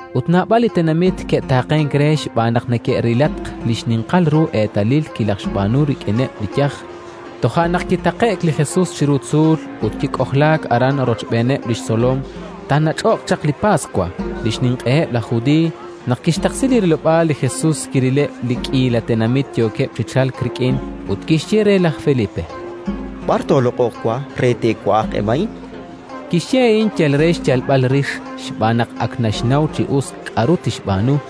ut naab'al li tenamit ke'taaqenk re xb'aan naq neke'rilatq li xninqal ru eetalil kilajxb'aanu rik'ineb' li yaj. Toja' naq kitaqe'k li Jesus chiru tzuul ut kik'ojlaak aran rochb'eeneb' li xtzolom. Taanach'oq chaq li Paswa, li xninq'eheb' laj Judiiy. Naq kixtaqsi li rilob'aal, li Jesus kirileb' li k'iila tenamit yookeb' chi chalk rik'in, ut kixye re laj Felipe: —B'ar tooloq'oq wa re te'wa'aq eb' a'in? Kixye a'in yal re xyalb'al rix, xb'aan naq ak naxnaw chi us k'aru tixb'aanu.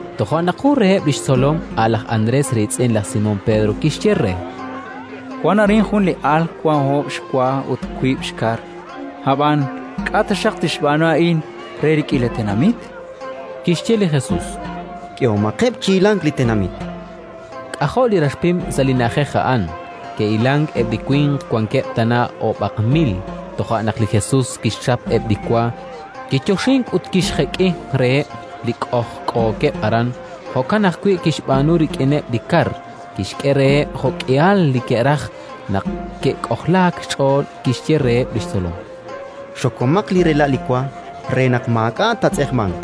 Toja' naq jun reheb' li xtzolom, a' laj Andrés riitz'in laj Simón Pedro, kixye re: —Wank arin jun li al wank oob' xwa ut wiib' xkar; ab'an k'a' taxaq tixb'aanu a'in re li k'iila tenamit? Kixye li Jesus: —K'ehomaqeb' chi hilank li tenamit. K'ajo' li rax pim sa' li na'ajej a'an. Ke'hilank eb' li winq: wankeb' tana oob'aq mil. Toja' naq li Jesus kixchap eb' li wa, kiyoxink ut kixjek'i reheb' li k'ojk'ookeb' aran. Jo'kan ajwi' kixb'aanu rik'ineb' li kar; kixk'e reheb' jo'k'ihal li ke'raj. Naq ke'k'ojlaak xch'ool, kixye reheb' li xtzolom: —Xokomaq li rela' li wa, re naq maak'a' taatz'eqmanq.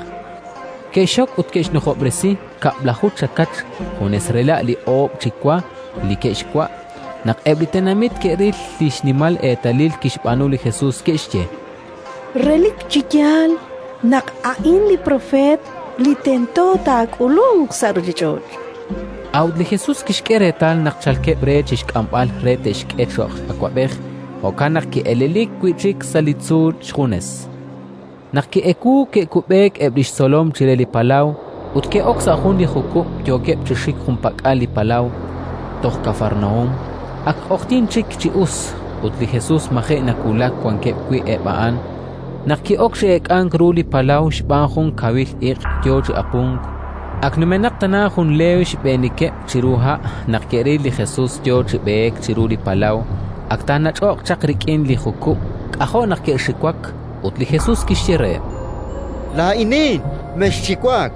Ke'xxok ut ke'xnujob'resi kab'laju chakach, junes rela' li oob' chi wa li ke'xwa'. Naq eb' li tenamit ke'ril li xnimal eetalil kixb'aanu li Jesus, ke'xye: —Relik chi yaal naq a'in li propeet li tento taak'ulunq sa' ruuchich'och'. A'ut li Jesus kixk'e reetal naq chalkeb' re chi xk'amb'al re te'xk'e cho'q awab'ej; jo'kan naq ki'elelik wi' chik sa' li tzuul xjunes. Naq ki'ewuuk, ke'kub'eek eb' li xtzolom chire li palaw ut ke'ok sa' jun li jukub', yookeb' chi xik junpak'al li palaw, toj Kafarnaúm. Ak q'oqyink chik chi us ut li Jesus maji' nawulak wankeb' wi' eb' a'an, naq ki'ok chi eek'ank ru li palaw xb'aan jun kawil iq' yo chi apunk. Ak numenaq tana jun leew xb'eenikeb' chiru ha' naq ke'ril li Jesus yo chi b'eek chiru li palaw, ak taanach'oq chaq rik'in li jukub'. K'ajo' naq ke'xiwak. Ut li Jesus kixye reheb': —Laa'inin, mexxiwak!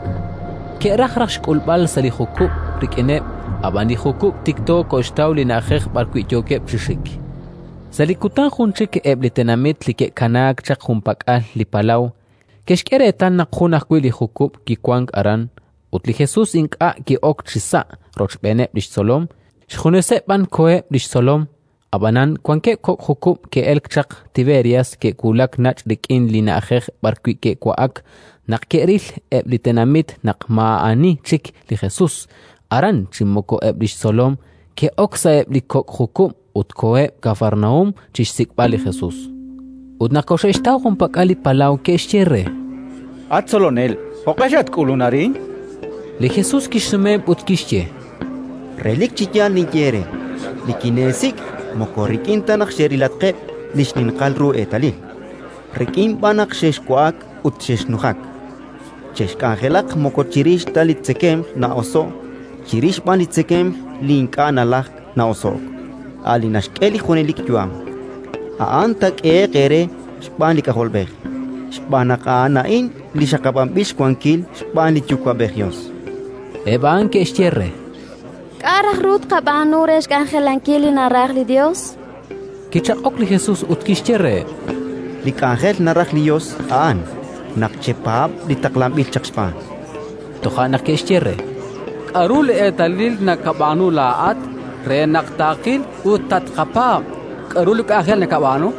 Ke'raj raj xk'ulb'al sa' li jukub' rik'ineb', ab'an li jukub' tikto koxtaw li na'ajej b'arwi' yookeb' chi xik. Sa' li kutan jun chik eb' li tenamit li ke'kanaak chaq junpak'al li palaw, ke'xk'e reetal naq jun ajwi' li jukub' kiwank aran ut li Jesus ink'a' ki'ok chisa' rochb'eeneb' li xtzolom, xjuneseb' b'an koheb' li xtzolom. Ab'anan wankeb' kok' jukub' ke'elk chaq Tiberias, ke'wulak nach' rik'in li na'ajej b'arwi' ke'wa'ak. Naq ke'ril eb' li tenamit naq maa'ani chik li Jesus aran chi moko eb' li xtzolom, ke'ok sa'eb' li kok' jukub' ut koheb' Kafarnaúm chi xsik'b'al li Jesus. Ut naq koxe'xtaw junpak'al li palaw, ke'xye re: —At Tzolonel, jo'q'e xatk'ulunk arin? Li Jesus kixsumeheb' ut kixye: —Relik chi yaal ninye eere: nikineesik' moko rik'in ta naq xerilatqeb' li xninqal ru eetalil, rik'in b'an naq xexwa'ak ut xexnujak. Chexk'anjelaq moko chirix ta li tzekemq na'oso'k, chirix b'an li tzekemq ink'a' nalajk na'oso'k, a' li naxk'e li junelik yu'am: a'an taak'ehe'q eere xb'aan li K'ajolb'ej, xb'aan naq A'an a'in li xaqab'anb'il xwankil xb'aan li Yuwa'b'ej Yos. Eb' a'an ke'xye re: —K'a' raj ru tqab'aanu re xk'anjelankil li naraj li Yos? Kichaq'ok li Jesus ut kixye reheb': —Li k'anjel naraj li Yos, a'an: naq chepaab' li taqlanb'il chaq xb'aan. Toja' naq ke'xye re: —K'aru li eetalil nakab'aanu laa'at re naq taaqil ut tatqapaab'? K'aru li k'anjel nakab'aanu?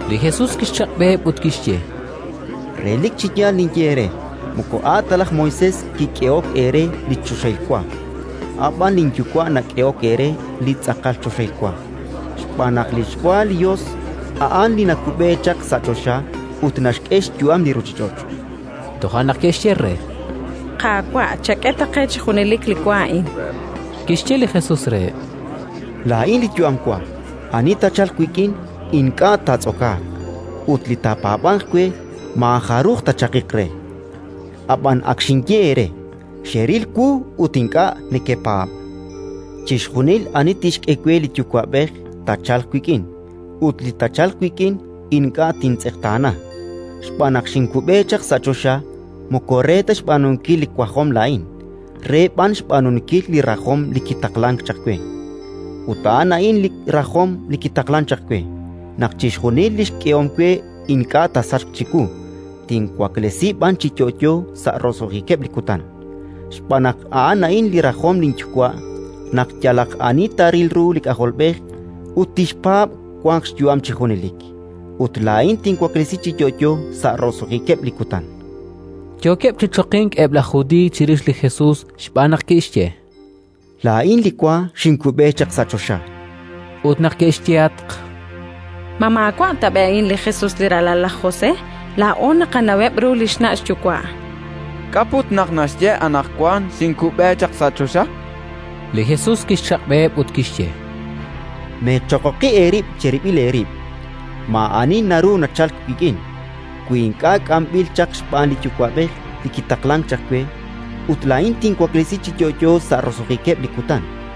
Li Jesus kixchaq'b'eheb' ut kixye: —Relik chi yaal ninye eere: moko a' ta laj Moisés kik'ehok eere li choxahil wa; a' b'an linYuwa' nak'ehok eere li tz'aqal choxahil wa. Xb'aan naq li xwa li Yos a'an li nakub'e chaq sa' choxa ut naxk'e xyu'am li ruuchich'och'. Toja' naq ke'xye re: —Qaawa', chak'e ta qe chi junelik li wa a'in. Kixye li Jesus reheb': —Laa'in li yu'am wa. Ani taachalq wik'in ink'a' taatz'okaaq, ut li taapaab'anq we maajaruj taachaqiq re. Ab'anan ak xinye eere: Xeril wu ut ink'a' nekepaab'. Chixjunil ani tixk'e we li Yuwa'b'ej taachalq wik'in, ut li taachalq wik'in ink'a' tintz'eqtaana. Xb'aan naq xinkub'e chaq sa' choxa moko re ta xb'aanunkil li wajom laa'in, re b'an xb'aanunkil li rajom li kitaqlank chaq we. Ut a'an a'in li rajom li kitaqlank chaq we: naq chixjunil li xk'ehom we ink'a' taasachq chiwu, tinwaklesi b'an chi yo'yo sa' roso'jikeb' li kutan. Xb'aan naq a'an a'in li rajom linYuwa': naq yalaq ani taaril ru li K'ajolb'ej ut tixpaab', wanq xyu'am chi junelik, ut laa'in tinwaklesi chi yo'yo sa' roso'jikeb' li kutan. Yookeb' chi choqink eb' laj Judiiy chirix li Jesus, xb'aan naq kixye: “Laa'in li wa xinkub'e chaq sa' choxa”. Ut neke'xyehatq: —Ma maawa' tab'i' a'in li Jesus, li ralal laj José? Laa'o naqanaweb' ru li xna' xyuwa'. K'a' put naq naxye anaqwan: «Xinkub'e chaq sa' choxa»? Li Jesus kixchaq'b'eheb' ut kixye: —Meechoqoqi eerib' cherib'il eerib'. Maa'ani naru nachalk wik'in, wi ink'a' k'amb'il chaq xb'aan li Yuwa'b'ej li kitaqlank chaq we; ut laa'in tinwaklesi chi yo'yo sa' roso'jikeb' li kutan.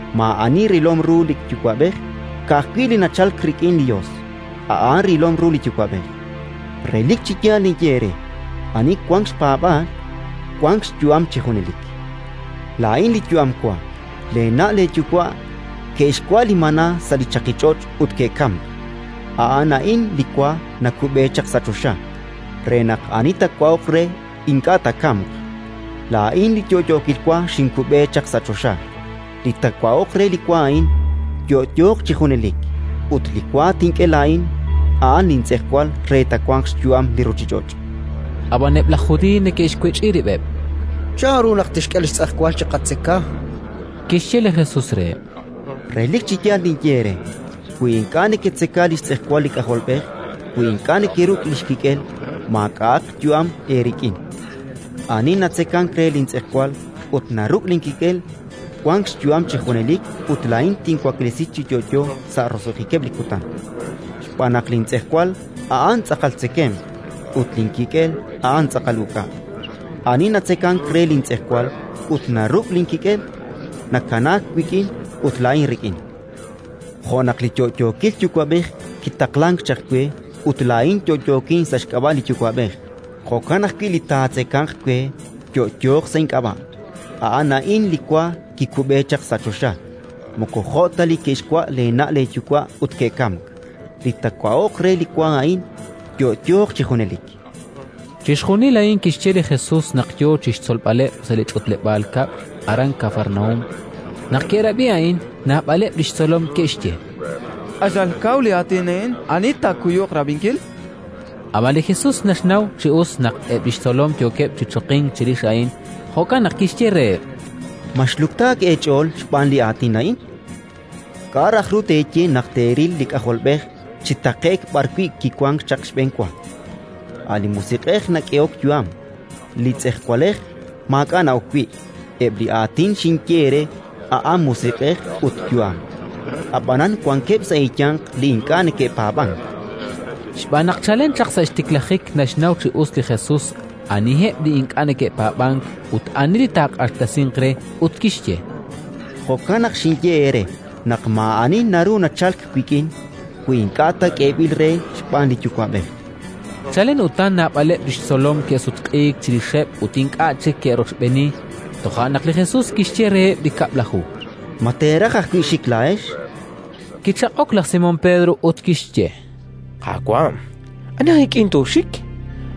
“Maa'ani rilom ru li Yuwa'b'ej; ka'ajwi' Li nachalk rik'in li Yos, a'an rilom ru li Yuwa'b'ej. Relik chi yaal ninye eere: ani wank xpaab'aal, wank xyu'am chi junelik. Laa'in li yu'am wa. Leena' leeyuwa' ke'xwa' li maná sa' li chaqich'och' ut ke'kamk. A'an a'in li wa nakub'e chaq sa' choxa, re naq ani taawa'oq re ink'a' taakamq. Laa'in li yo'yookil wa xinkub'e chaq sa' choxa. Li taawa'oq re li wa a'in, yo'yooq chi junelik; ut li wa tink'e laa'in, a'an lintz'ejwal re twanq xyu'am li ruuchich'och'”. Ab'an eb' laj Judiiy neke'xwech'i rib'eb': —Chanru naq a'in tixk'e li xtz'ejwal chiqatzeka, chankeb'. Kixye li Jesus reheb': —Relik chi yaal ninye eere: wi ink'a' neketzeka li xtz'ejwal li K'ajolb'ej, wi ink'a' nekeruk' li xkik'el, maak'a'aq yu'am eerik'in. Ani natzekank re lintz'ejwal ut naruk' linkik'el, wank xyu'am chi junelik ut laa'in tinwaklesi chi yo'yo sa' roso'jikeb' li kutan. Xb'aan naq lintz'ejwal a'an tz'aqal tzekemq ut linkik'el a'an tz'aqal uk'a'. Ani natzekank re lintz'ejwal ut naruk' linkik'el, nakanaak wik'in ut laa'in rik'in. Jo' naq li yo'yookil Yuwa'b'ej kitaqlank chaq we ut laa'in yo'yookin sa' xk'ab'a' li Yuwa'b'ej, jo'kan ajwi' li taatzekanq we yo'yooq sa' ink'ab'a'. A'an a'in li wa kikub'e chaq sa' choxa; moko jo' ta li ke'xwa' leena' leeyuwa' ut ke'kamk. Li taawa'oq re li wa a'in, yo'yooq chi junelik. Chixjunil a'in kixye li Jesus naq yo chi xtzolb'aleb' sa' li ch'utleb'aal kab'l aran Kafarnaúm. Naq ke'rab'i a'in, naab'aleb' li xtzolom ke'xye: —Q'axal kaw li aatin a'in. Ani taakuyuq rab'inkil? Ab'an li Jesus naxnaw chi us naq eb' li xtzolom yookeb' chi choqink chirix a'in; jo'kan naq kixye reheb': —Ma xluktaak eech'ool xb'aan li aatin a'in? K'a' raj ru teeye naq teeril li K'ajolb'ej chi taqe'k b'arwi' kiwank chaq xb'enwa? A' li musiq'ej nak'ehok yu'am; li tz'ejwalej maak'a' na'ok wi'. Eb' li aatin xinye eere a'an musiq'ej ut yu'am. Ab'anan wankeb' sa' eeyanq li ink'a' neke'paab'ank. Xb'aan naq chalen chaq sa' xtiklajik naxnaw chi us li Jesus aniheb' li ink'a' neke'paab'ank ut ani li taaq'axtesinq re. Ut kixye: —Jo'kan naq xinye eere naq maa'ani naru nachalk wik'in, wi ink'a' ta k'eeb'il re xb'aan li Yuwa'b'ej. Chalen utan naab'aleb' li xtzolom ke'sutq'iik chirixeb' ut ink'a' chik ke'rochb'eeni. Toja' naq li Jesus kixye reheb' li Kab'laju: —Ma teeraj ajwi' xik laa'ex? Kichaq'ok laj Simón Pedro ut kixye: —Qaawa', ani aj ik'in tooxik?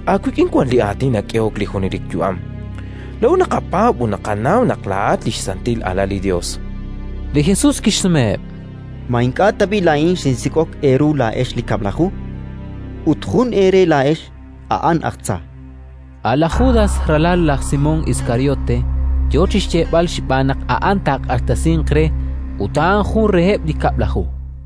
Aawik'in wank li aatin nak'ehok li junelik yu'am. Laa'o naqapaab' ut naqanaw naq laa'at li xSantil Alal li Yos. Li Jesus kixsumeheb': —Ma ink'a' tab'i' laa'in xinsik'ok eeru laa'ex li Kab'laju? Ut jun eere laa'ex, a'an aj tza. A' laj Judas, ralal laj Simón Iskariote, yo chi xyeeb'al xb'aan naq a'an taaq'axtesinq re, ut a'an jun reheb' li Kab'laju!